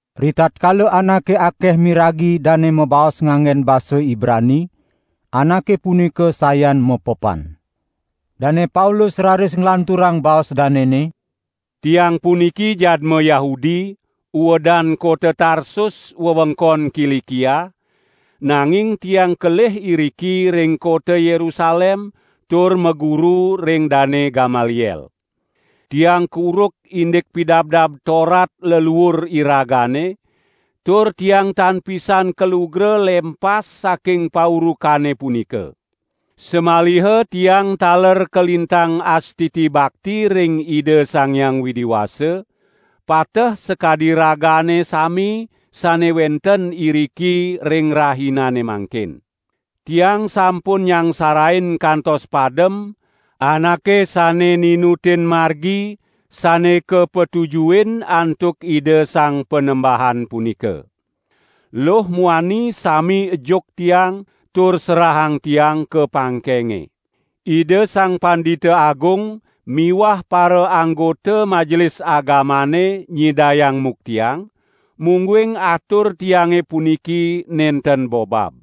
Ritatkala anake akeh miragi dane mabaos nganggen basa Ibrani, anake punika sayan mepepan. Dane Paulus raris nglanturang baos danene: "Tiang puniki jadma Yahudi, uedan kota Tarsus wewengkon Kilikia, nanging tiang kelih iriki ring kota Yerusalem tur maguru ring Dane Gamaliel. Tiang kuruk indik Pidabdab Torat leluur iragane, tur tiang tan pisan kalugra lempas saking paurukane punika. Samaliha tiang taler kalintang astiti bakti ring Ida Sang Hyang Widi Wasa, pateh sakadi ragane sami sane wenten iriki ring rahinane mangkin. Tiang sampun nyangsarain kantos padem, anake sane ninutin Margi sane kapatujuhin antuk Ida Sang Panembahan punika. Luh muani sami ejuk tiang tur serahang tiang ka pangkenge. Ida Sang Pandita Agung miwah paraanggota Majelis Agamane nyidayang muktiang, mungguing atur tiange puniki nenten bobab.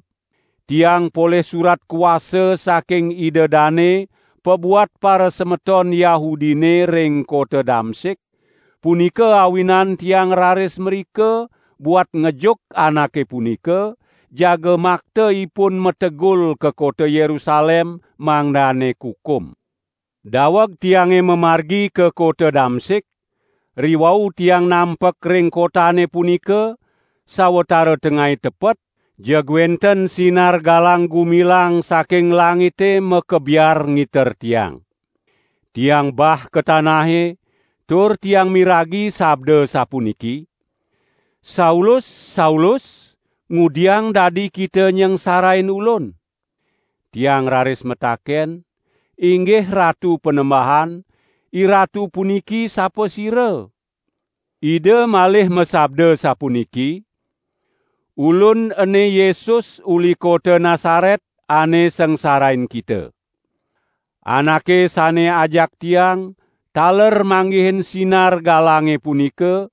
Tiang polih surat kuasa saking ida dane pabuat parasemeton Yahudine ring kota Damsik, punika awinan tiang raris mrika buat ngejuk anake punika, jaga makta ipun mategul ka kota Yerusalem, mangdane kukum." "Daweg tiange mamargi ka kota Damsik, riwau tiang nampek ring kotane punika, sawatara tengai tepet, jeg wenten sinar galang-gumilang saking langite makebiar ngiter tiang. Tiang bah ka tanahe, tur tiang miragi sabda sapuniki: 'Saulus, Saulus! Ngudiang dadi kita nyangsarain Ulun?' Tiang raris mataken: 'Inggih Ratu Panembahan, IRatu puniki sapasira?' Ida malih masabda sapuniki: 'Ulun ene Yesus uli kota Nasaret, ane sangsarain kita.' Anake sane ajak tiang, taler manggihin sinar galange punika,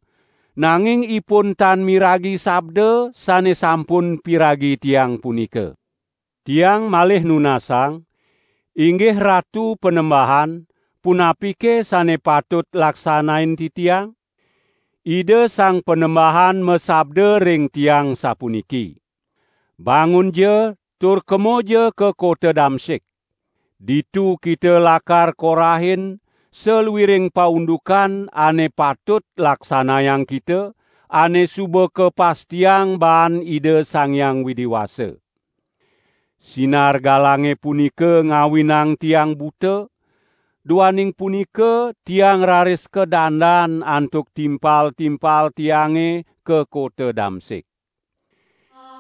nanging ipun tan miragi sabda sane sampun piragi tiang punika. Tiang malih nunasang: 'Inggih Ratu Panembahan punapike sane patut laksanain titiang?' Ida Sang Panembahan masabda ring tiang sapuniki: 'Bangunja tur kemaja ka kota Damsik. Ditu kita lakar korahin saluiring paundukan ane patut laksanayang kita, ane suba kapastiang baan Ida Sang Hyang Widi Wasa.' Sinar galange punika ngawinang tiang buta, duaning punika tiang raris kadandan antuk timpal-timpal tiange ka kota Damsik.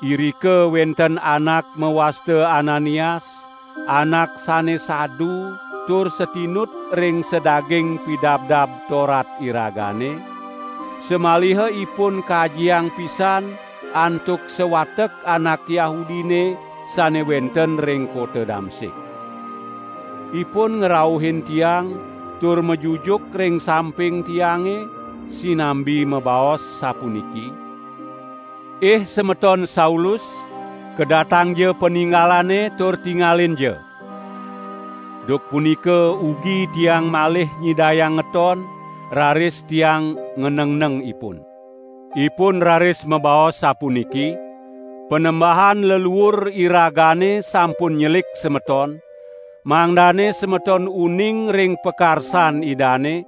Irika wenten anak mawasta Ananias, anak sane sadu tur satinut ring sadaging Pidabdab Torat iragane, samaliha ipun kajiang pisan antuk sawatek anak Yahudine sane wenten ring kota Damsik. Ipun ngrauhin tiang tur majujuk ring samping tiange, sinambi mabaos sapuniki: 'Ih semeton Saulus, kedatangja paningalane tur tingalinja!' Duk punika ugi tiang malih nyidayang ngeton, raris tiang nganengneng ipun. Ipun raris mabaos sapuniki: 'Panembahan leluur iragane sampun nyelik semeton, mangdane semeton uning ring pakarsan Idane,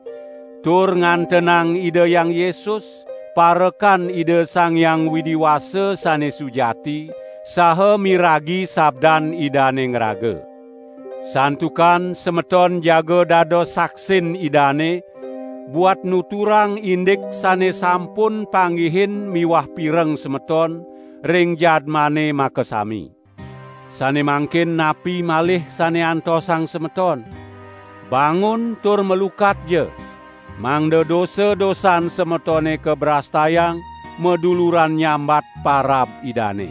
tur ngantenang Ida Hyang Yesus, parekan Ida Sang Hyang Widi Wasa sane sujati, saha miragi sabdan Idane ngraga. Santukan semeton jaga dados saksin Idane, buat nuturang indik sane sampun panggihin miwah pireng semeton, ring jadmane makasami. Sane mangkin napi malih sane antosang semeton? Bangun tur malukatja, mangda dosa-dosan semetone kabrastayang maduluran nyambat parab Idane.' "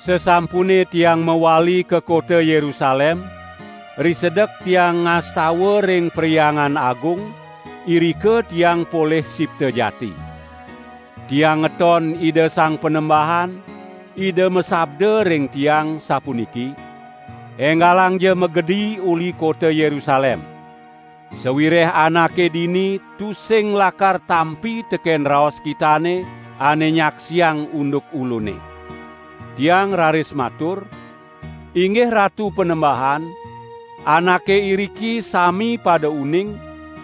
"Sasampune tiang mawali ka kota Yerusalem, risedek tiang ngastawa ring Perhyangan Agung, irika tiang polih sipta jati. Tiang ngeton Ida Sang Panembahan, Ida masabda ring tiang, sapuniki: 'Enggalangja magedi uli kota Yerusalem! Sawireh anake dini tusing lakar tampi teken raos kitane ane nyaksiang unduk Ulune.' Tiang raris matur: 'Inggih Ratu Panembahan, anake iriki sami pada uning,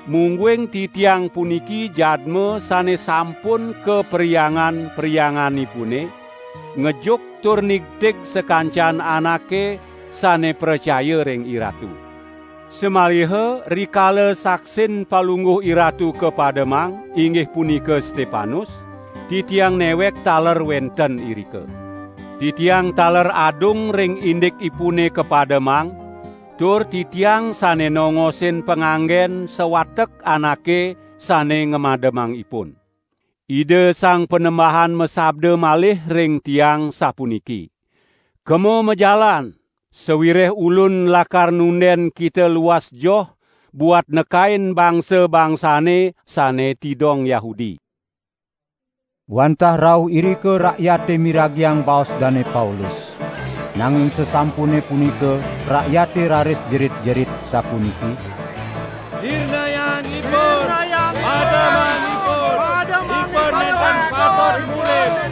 mungguing titiang puniki jadma sane sampun ka perhyangan-perhyanganipune, ngejuk tur nigtig sakancan anake sane pracaya ring IRatu. Samaliha rikala saksin Palungguh IRatu kapademang, inggih punika Stepanus, titiang newek taler wenten irika. Titiang taler adung ring indikipune kapademang, tur titiang sane nongosin panganggen sawatek anake sane ngamademang ipun.' Ida Sang Panembahan masabda malih ring tiang sapuniki: 'Kema majalan, sawireh Ulun lakar nunden kita luas joh buat nekain bangsa-bangsane sane tidong Yahudi.' " Wantah rauh irika rakyate miragiang baos Dane Paulus, nanging sasampune punika rakyate raris jerit-jerit sapuniki: "Sirnayang ipun! Pademang ipun! Ipun nenten patut murip!"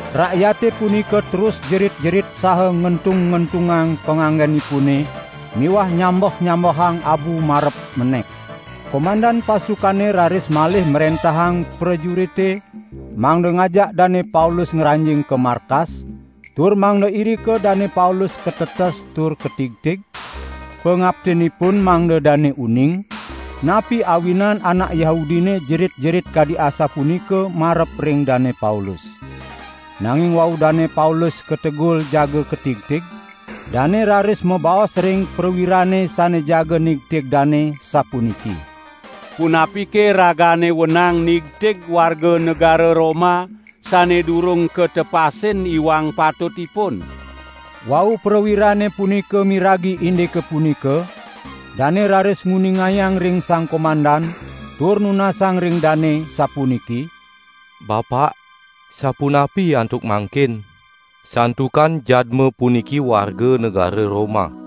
Rakyate punika terus jerit-jerit saha ngentung-ngentungang panganggenipune miwah nyambeh-nyambehang abu marep menek. Komandan pasukane raris malih mrentahang prajurite mangda ngajak Dane Paulus ngranjing ka markas tur mangda irika Dane Paulus katetes tur katigtig, pangaptinipun mangda dane uning, napi awinan anak Yahudine jerit-jerit kadi asapunika marep ring Dane Paulus. Nanging wau Dane Paulus kategul jaga katigtig, dane raris mabaos ring prawirane sane jaga nigtig dane, sapuniki: "Punapike ragane wenang nigtig warga negara Roma, sane durung katepasin iwang patutipun?" Wau prawirane punika miragi indike punika dane raris nguningayang ring sang komandan tur nunasang ring dane sapuniki: "Bapak, sapunapi antuk mangkin? Santukan jadma puniki warga negara Roma."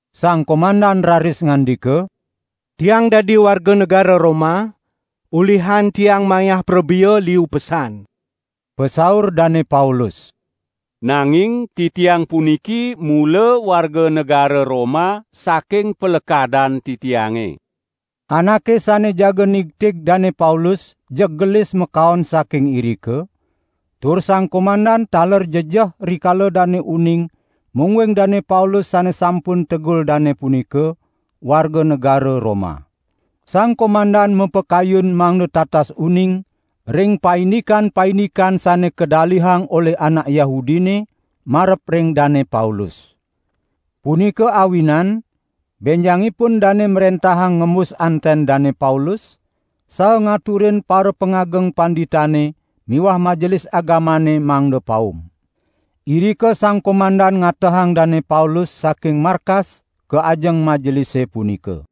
Sang komandan raris ngandika: "Tiang dadi warga negara Roma, ulihan tiang mayah prabea liu pesan." Pasaur Dane Paulus: "Nanging titiang puniki mula warga negara Roma saking palekadan titiange." Anake sane jaga nigtig Dane Paulus, jeg gelis makaon saking irika; tur sang komandan taler jejeh rikala dane uning mungguing Dane Paulus sane sampun tegul dane punika, warga negara Roma. Sang komandan mapakayun mangda tatas uning ring paindikan-paindikan sane kadalihang olih anak Yahudine marep ring Dane Paulus. Punika awinan benjangipun dane mrentahang ngembus anten Dane Paulus, saha ngaturin parapangageng panditane miwah Majelis Agamane mangda paum. Irika sang komandan ngatehang Dane Paulus saking markas ka ajeng Majelise punika.